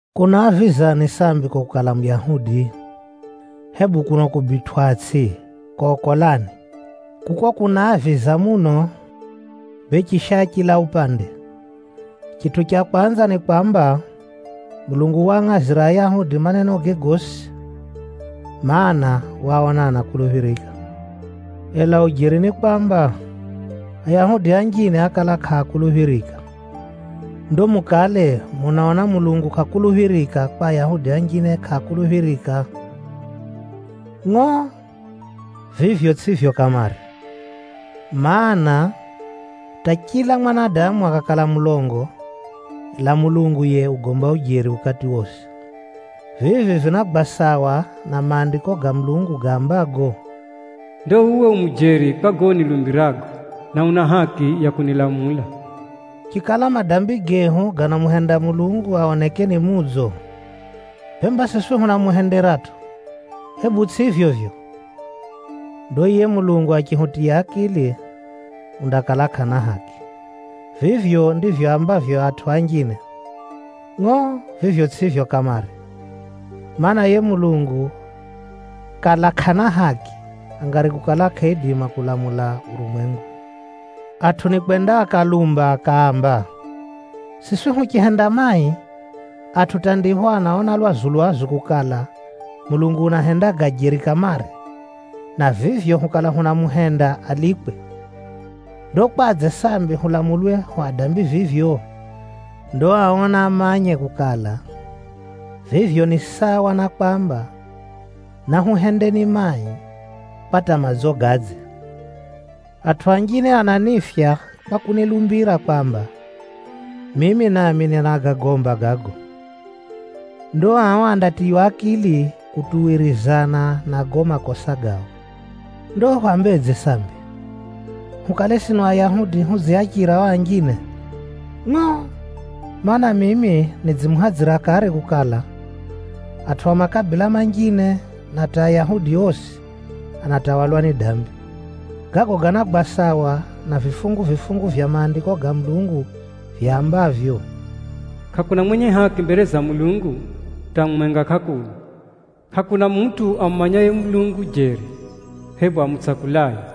Kunaavizani sambi ko kukala Muyahudi? Hebu kuno kubitwʼatsʼi, kokolani? Kuko kunaaviza muno, bee chisha chila upande. Chitʼu cha kwanza ni kwamba, Mulungu waangʼazira Ayahudi manenoge gosi, mana, waaona anakuluphirika. Ela ujeri ni kwamba, Ayahudi anjine ákala kʼaakuluphirika. Ndo mukale munaona Mulungu kʼakuluphirika kwa Ayahudi anjine kʼaakuluphirika? Ngʼo! Vivyo tsʼivyo kamare! Maana, hata chila mwanadamu akakala mulongo, ela Mulungu yiye ugomba ujeri ukati wosi. Vivi vinagwa sawa na Maandiko ga Mulungu gaambago, “Ndo uwe u mujeri kwa gago unilumbirago, na una haki ukati unilamulapho.” “Chikala madambi gehu ganamuhenda Mulungu aoneke ni mudzo, bemba siswi hunamuhenderatʼo, hebu tsʼivyo vivyo? Ndo yiye Mulungu achihutiya akili, undakala kʼana haki.” (Vivyo ndivyo aambavyo atʼu anjine.) Ngʼo! Vivyo tsʼivyo kamare! Maana, yiye Mulungu kala kʼana haki, angari kukala kʼaidima kuulamula urumwengu. Atʼu nikwenda akalumba akaamba, “Siswi huchihenda mai, atʼu hata ndipho anaona lwazu-lwazu kukala, Mulungu unahenda ga jeri kamare, na vivyo hukala hunamuhenda alikwe. Ndo kwadze sambi hulamulwe hu adambi vivyo?” Ndo ao naamanye kukala, vivyo ni sawa na kwamba, “Nahuhendeni mai, kwa hata madzo gadze.” Atʼu anjine ananiifya kwa kunilumbira kwamba, mimi nami ninagagomba gago. Ndo ao andatiywa akili kutuwirizana na gago makosa gao. Ndo hwambedze sambi? Hukale sino Ayahudi hudziachira o anjine? Ngʼo! Maana, mimi nidzimuhadzira kare kukala, atʼu a makabila manjine na hata Ayahudi osi, anatawalwa ni dambi. Gago ganagwa sawa na vifungu-vifungu vya Maandiko ga Mulungu vyambavyo: “Kʼakuna mwenye haki mbere za Mulungu, hata mumwenga kʼakuna! Kʼakuna mutʼu amumanyaye Mulungu jeri, hebu amutsakulaye.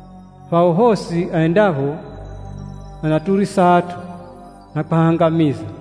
Phao phosi endapho anaturisa atʼu, na kwahangamiza.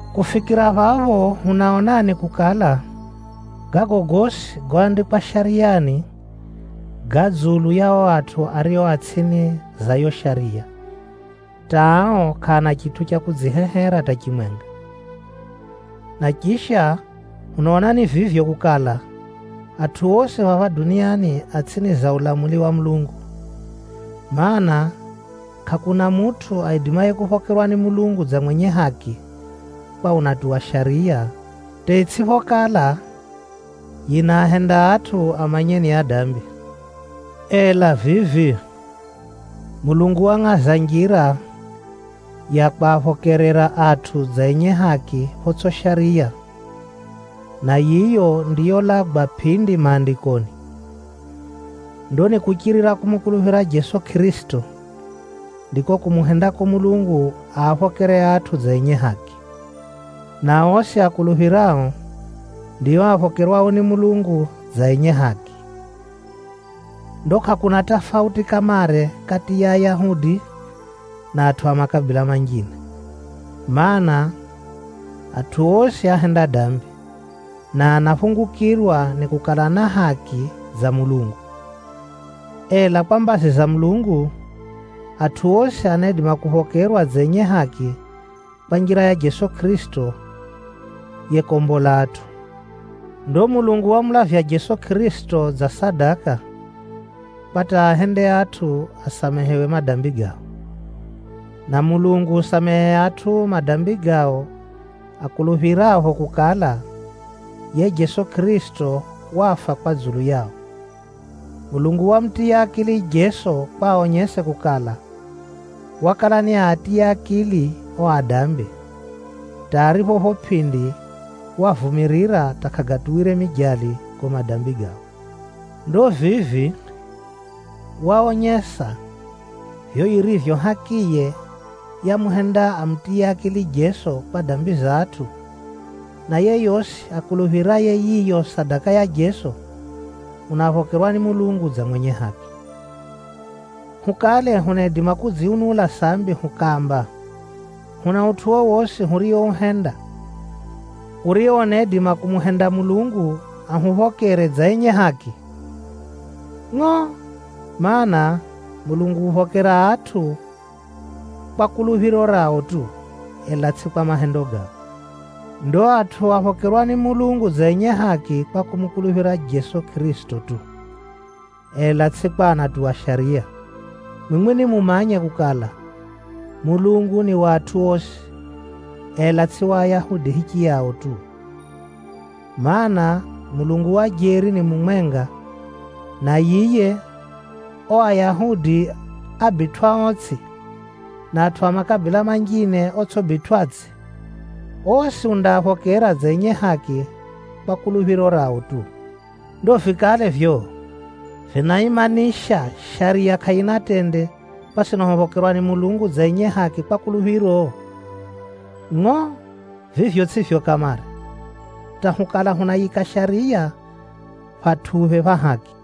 Kufikira phapho hunaonani kukala, gago gosi goandikwa Shariyani, ga dzulu ya o atʼu ario a tsʼini za yo Shariya, hata ao kʼaana chitʼu cha kudzihehera hata chimwenga. Na chisha, hunaonani vivyo kukala, atʼu osi phapha duniani a tsʼini za ulamuli wa Mulungu. Maana, kʼakuna mutʼu aidimaye kuphokerwa ni Mulungu dza mwenye haki kwa unatuwa Shariya, hata itsʼiphokala, yinaahenda atʼu amanye ni adambi. Ela vivi, Mulungu wangʼaza njira ya kwaphokerera atʼu dza enye haki photsʼi shariya, na yiyo ndiyolagwa pʼindi Maandikoni. Ndo ni kuchirira kumukuluphira Jeso Kʼirisito, ndiko kumuhendako Mulungu aaphokere atʼu dza enye haki. Na osi akuluphirao, ndio aphokerwao ni Mulungu dza enye haki. Ndo kʼakuna tafauti kamare kati ya Ayahudi, na atʼu a makabila manjine. Maana, atʼu osi áhenda dambi, na anaphungukirwa ni kukala na haki dza Mulungu. Ela kwa mbazi za Mulungu, atʼu osi anaidima kuphokerwa dza enye haki kwa njira ya Jeso Kʼirisito yekombola atʼu. Ndo Mulungu wamulavya Jeso Kʼirisito dza sadaka, kwa hata aahende atʼu asamehewe madambi gao. Na Mulungu usamehe atʼu madambi gao akuluphirapho kukala, yiye Jeso Kʼirisito wafa kwa dzulu yao. Mulungu wamutiya akili Jeso kwa aonyese kukala, wakala niaatiye akili o adambi, hata aripho pho pʼindi wavumirira hata kʼagatuwire mijali gago madambi gao. Ndo vivi, waonyesa vivyo yirivyo hakiye yamuhenda amutiye akili Jeso kwa dambi za atʼu, na yeyosi akuluphiraye yiyo sadaka ya Jeso, unaphokerwa ni Mulungu dza mwenye haki. Hukale hunaidima kudziunula sambi hukaamba, huna utʼu wowosi huriouhenda, urio unaidima kumuhenda Mulungu ahuphokere dza enye haki? Ngʼo! Maana, Mulungu uphokera atʼu kwa kuluphiro rao tu, ela tsʼi kwa mahendo gao. Ndo atʼu aphokerwa ni Mulungu dza enye haki kwa kumukuluphira Jeso Kʼirisito tu, ela tsʼi kwa kutuwa Shariya. Mwimwi nimumanye kukala, Mulungu ni wa atʼu osi, ela tsʼi wa Ayahudi hichiyao tu. Maana, Mulungu wa jeri ni mumwenga, na yiye, o Ayahudi abitwʼaotsʼi, na atʼu a makabila manjine otsʼibitwʼatsʼi, osi undaaphokera dza enye haki kwa kuluphiro rao tu. Ndo vikale vivyo vinaimanisha Shariya kʼayina tende kwa sino huphokerwa ni Mulungu dza enye haki kwa kuluphiro? Ngʼo! Vivyo tsʼivyo kamare, hata hukala hunayiika Shariya phatʼuphe pha haki.